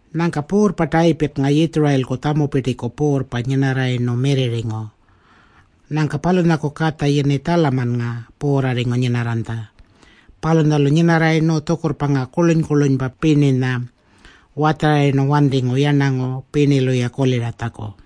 Nyangka puurrpa Tayipirrnga Yitjurayilku tjampupirtiku puurrpa nyinarrayirnu mirrirringu. Nyangka palunyaku katja yini Tjalamannga puurrarringu nyinarranytja. Palunyalu nyinarrayirnu tjukurrpa ngaa kurluny-kurlunypa pirninya watjarayirnu wantingu yarnangu pirnilu-ya kuliratjaku.